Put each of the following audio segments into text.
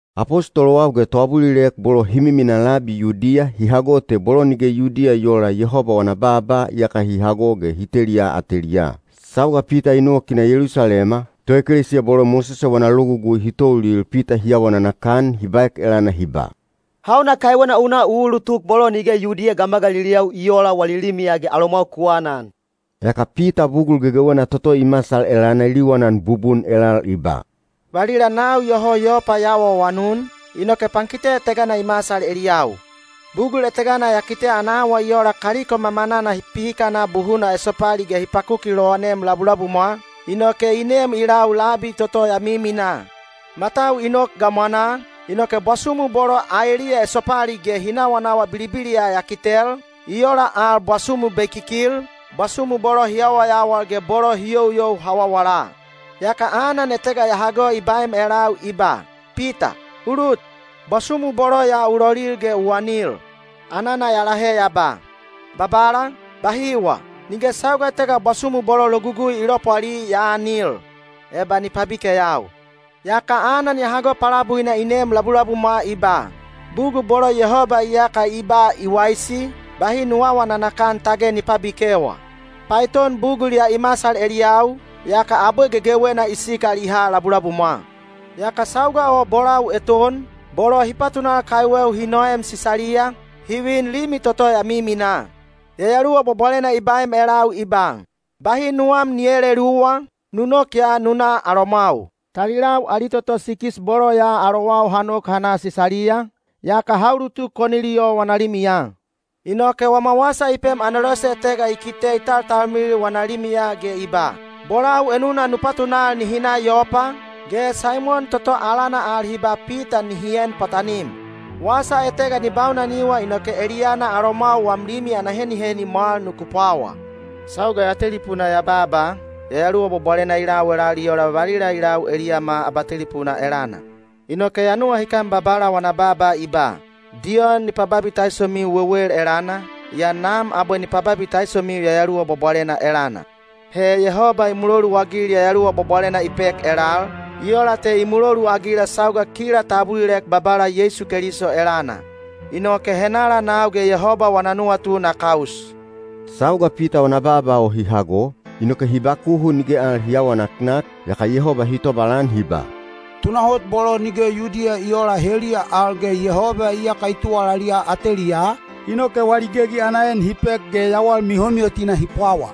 Apostolowau ge toabulilek bolo hi miminaa labi Yudiya hi hago te bolo nige Yudiya i oola Yehoba wana baaba iyaka hi hago ge hi teliya ateliyaa. Sauga Pita i nok i na Yelusalema, toekelesiya bolo Mosese wana Logugui hi toulil Pita hi awa nanakan hi baek elana hi ba, “Hauna kaiwena u na u ulutuk bolo nige Yudiya gamagaliliyau i oola wali limiya ge alomwau ku anan?” Yaka Pita bugul gegewena toto i masal elana i liwanan bubun elal i ba, “Valila nau iyoho Yopa ya awaawanun, inoke pankite etega i masal eliyau. Bugul etega ya kite ana awa i ola kaliko mamanana hi pihikana buhuna esopali ge hi pakuki lowanem labulabumwa, inoke i nem i lau labi toto ya miminaa. Matau i nok gamwanaa, inoke bwasumu bolo aeliya esopali ge hi nawanawa bilibiliya ya kitel, i ola al bwasumu bekikil, bwasumu bolo hi yawayawal ge bolo hi youyou hawawala. Yaka anan etega ya hago i baem elau i ba, ‘Pita, u lut, bwasumu bolo ya u lolil ge u anil.’ Anana ya lahe ya ba, ‘Babala, bahiwa! Nige sauga etega bwasumu bolo Logugui i lopwali ya aanil, eba ni pabikeyau.’ Yaka anan ya hago palabuina i neem labulabumwa i ba, ‘Bugul bolo Yehoba iyaka i ba i waisi, bahi nu aawa nanakan tage ni pabikewa.’ Paeton bugul ya i masal eliyau, yaka abwe gegewena i sikal i ha labulabumwa. Yaka sauga o bolau eton, bolo hi patunal kaiweu hi noem Sisaliya, hi vin limi toto ya miminaa. Yayaluwa Bwabwalena i baem elau i ba, ‘Bahi nuwam ni eeleluwa, nu nok ya nu na alomwau.’ Talilau ali toto sikis bolo ya alowau ha nok ha na Sisaliya, yaka ha ulutuk Koniliyo wana limiya. Inoke wama wasa i pem anelose etega i kite i taltalmilil wana limiya ge i ba, ‘Bolau enuna nu patunal nihi na Yopa, ge Saimon toto alana al hi ba Pita nihi en pwatanim. Wasa etega ni baunaniwa inoke eliyana alomwau wam limi ana heniheni mwal nuku pwawa.’ Sauga ya telipuna ya baaba, Yayaluwa Bwabwalena i lau elal i ola valila i lau eliyama abatelipuna elana. Inoke ya nuwahikan Babala wana baaba i ba, ‘Diyon i pababitaisomiu wewel elana, yaa Nam abwe ni pababitaisomiu Yayaluwa Bwabwalena elana.’ He Yehoba i muloluagil Yayaluwa Bwabwalena i pek elal, i ola te i muloluagila sauga kila ta abulilek Babala Yeisu Keliso elana. Inoke henala nau ge Yehoba wana nuwatu na kaus?” Sauga Pita wana baaba o hi hago, inoke hi bakuhu nige al hi aawa naknak, yaka Yehoba hi tobalan hi ba, “Tunahot bolo nige Yudiya i oola, heliya al ge Yehoba iyaka i tuwalaliya ateliyaa, inoke wali gegi ana en hi pek ge yawal mihomihotina hi pwawa.”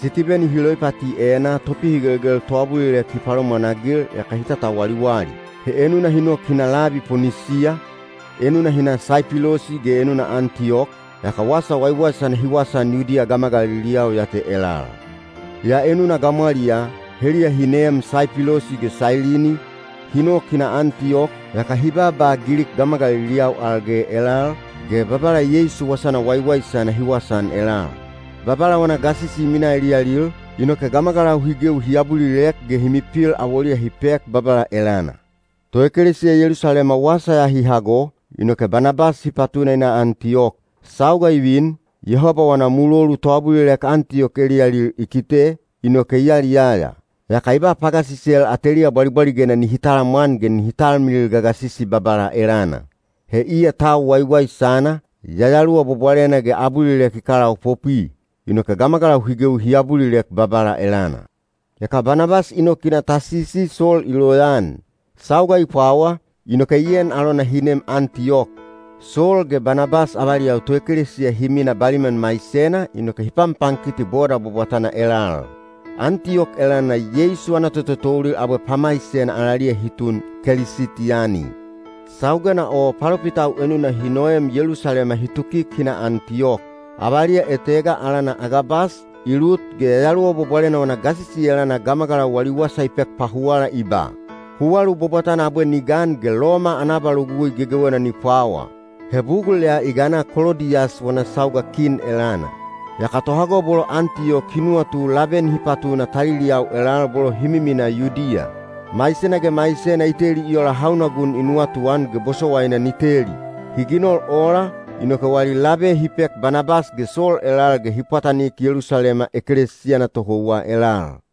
Sitibeni hi loipati enaa topihigelgel toabulilek hi palomwanagil yaka hi tatawaliwali. He enuna hi nok hi na labi Ponisiya, enuna hi na Saipilosi ge enuna Antiyok, yaka wasa waiwaisana hi wasaan Yudiya gamagaliliyau ya te elal. Yaa enuna gamwaliyaa, heliya hi neem Saipilosi ge Sailini, hi nok hi na Antiyok, yaka hi baaba Gilik gamagaliliyau al ge elal, ge Babala Yeisu wasana waiwaisana hi wasaan elal. Babala wana gasisi i minaa eliyalil, inoke gamagalau hi gewi hi abulilek ge hi mipil awoliya hi pek Babala elana. Toekelesiya Yelusalema wasa ya hi hago, inoke Banabas hi patuna i na Antiyok. Sauga i vin, Yehoba wana mulolu toabulilek Antiyok eliyalil i kite, inoke i yaliyaya. Yaka i ba pagasisel ateliya bwalibwaligena nihi talamwan ge nihi talmilil gagasisi Babala elana. He iya tau waiwaisana, Yayaluwa Bwabwalena ge abulilek i kalaopopwi. Inoke gamagalau hi gewi hi abulilek Babala elana. Yaka Banabas i nok i na Tasisi Sol i loyaan. Sauga i pwawa, inoke i en alona hi nem Antiyok. Sol ge Banabas avaliyau toekelesiya hi mina baliman maisena inoke hi panpankiti boda bwabwatana elal. Antiyok elana Yeisu ana tototoulil abwe pamaisena alaliya hi tun “Kelisitiyani.” Saugena o palopitau enuna hi noem Yelusalema hi tukik hi na Antiyok. Avaliya etega, alana Agabas, i lut ge Yayaluwa Bwabwalena wana gasisi elana gamagalau wali wasa i pek pahuwala i ba, “Huwalu bwabwatana abwe ni gan ge Loma ana abalogugui gegewena ni pwawa.” (He bugul ya i gana Kolodiyas wana sauga kin elana.) Yaka tohago bolo Antiyok hi nuwatu labe nihi patuna taliliyau elal bolo hi miminaa Yudiya. Maisena ge maisena i teli i ola hauna gun i nuwatuan ge bosowaina ni teli. Hi ginol ola, inoke wali labe hi pek Banabas ge Sol elal ge hi pwatanik Yelusalema ekelesiya ana tohouwa elal.